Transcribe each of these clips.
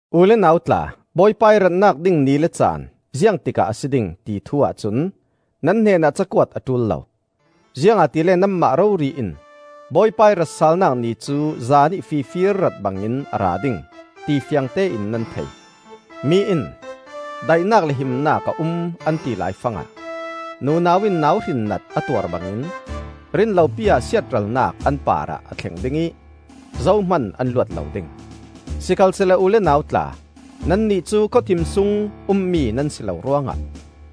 U le nau tla, Bawipa ih ratnak ding ni le caan, ziangtikah a si ding, ti thu ahcun nan hnenah ca kuat a ṭul lo. Ziangahtile nanmah rori in Bawipa ih ratsalnak Ni cu zan ih fifir rat bangin a ra ding, ti fiangtein nan thei. Mi in, “Daihnak le himnak a um,” an ti laifangah nunau in nauhrinnat a tuar bangin rinlopi ah siatralnak an parah a thleng ding ih zohman an luat lo ding. Sikhalsehla u le nau tla, nannih cu khawthim sung ummi nan si lo ruangah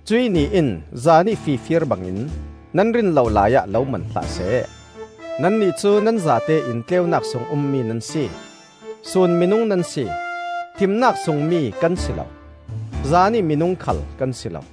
cuih Ni in zanih fifir bangin nan rin lo laiah lo man hlah seh. Nannih cu nan zate in tleunak sung ummi nan si; sun minung nan si. Thimnak sungmi kan si lo; zanih minung khal kan si lo.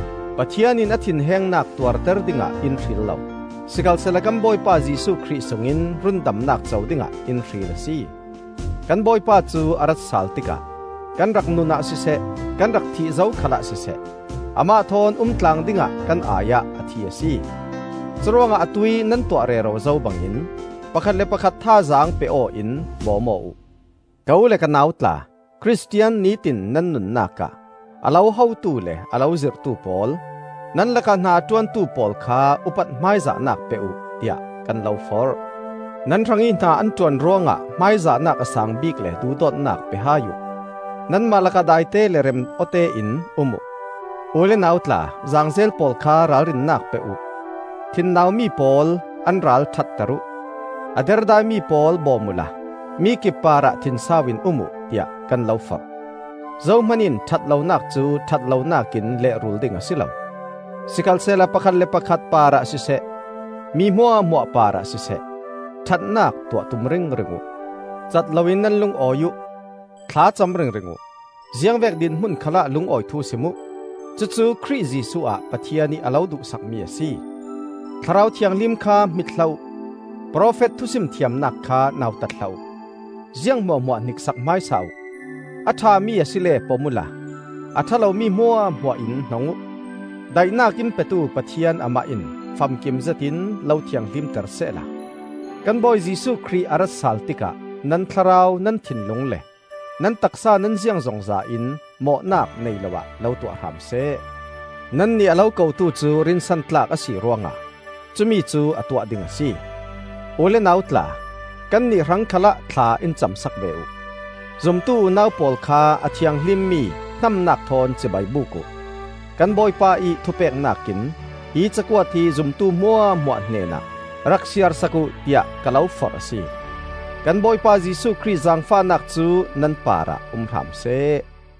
Pathian in a thinhengnak tuarter dingah in hril lo; sikhalsehla kan Bawipa Jesuh Khrih sungin rundamnak co dingah in hril a si. Kan Bawipa cu a ratsal tikah kan rak nunah siseh, kan rak thih zo khalah siseh, amah thawn umtlang dingah kan ai-ah a thi a si. Curuangah atuih nan tuah rero zo bangin pakhat le pakhat thazaang pe aw-in bawm aw uh. Ka u le ka nau tla, Khristian nitin nan nunnak ah a lo hotu le a lo zirhtu pawl, nan lakah hna a ṭuantu pawl kha upat hmaizahnak pe uh, tiah kan lo forh. Nan hrangih hna an ṭuan ruangah hmaizahnak a saang bik le duhdawtnak pe hai uh. Nanmah lakah daite le rem-awtein um uh. U le nau tla, zaangzel pawl kha ralrinnak pe uh, thinnau mi pawl an ral ṭhatter uh, a derdaimi pawl bawm uhla mikip parah thinsau in um uh, tiah kan lo forh. Zohman in ṭhat lonak cu ṭhatlonak in lehrulh ding a si lo; sikhalsehla pakhat le pakhat parah siseh, mi hmuahhmuah parah siseh, ṭhatnak tuah tum ringring uh. Cat loin nan lungawi uh; thlacam ringring uh. Ziangvek dinhmun khalah lungawi thu sim uh. Cucu Khrih Jesuh ah Pathian ih a lo duhsakmi a si. Thlarau Thianghlim kha hmit hlah uh; profet thusim thiamnak kha nautat hlah uh. Ziang hmuahhmuah hniksak hmaisa uh; a ṭhami asile pom uhla, a ṭha lomi hmuahhmuah in hnong uh. Daihnak in petu Pathian amah in famkim zetin lo thianghlimter sehla, kan Bawi Jesuh Khrih a ratsal tikah nan thlarau, nan thinlung le nan taksa, nan ziangzongza in mawhnak nei lo ah lo tuah hram seh. Nannih a lo kotu cu rinsan tlak a si ruangah cumicu a tuah ding a si. U le nau tla, kannih hrang khalah thla in cam sak ve uh. Zumtu unau pawl kha a thianghlimmi hnamnak thawn cibai buk uh. Kan Bawipa ih thupeknak in hi cakuat hi zumtu hmuahhmuah hnenah rak siarsak uh tiah ka lo forh a si. Kan Bawipa Jesuh Khrih zangfahnak cu nan parah um hram seh.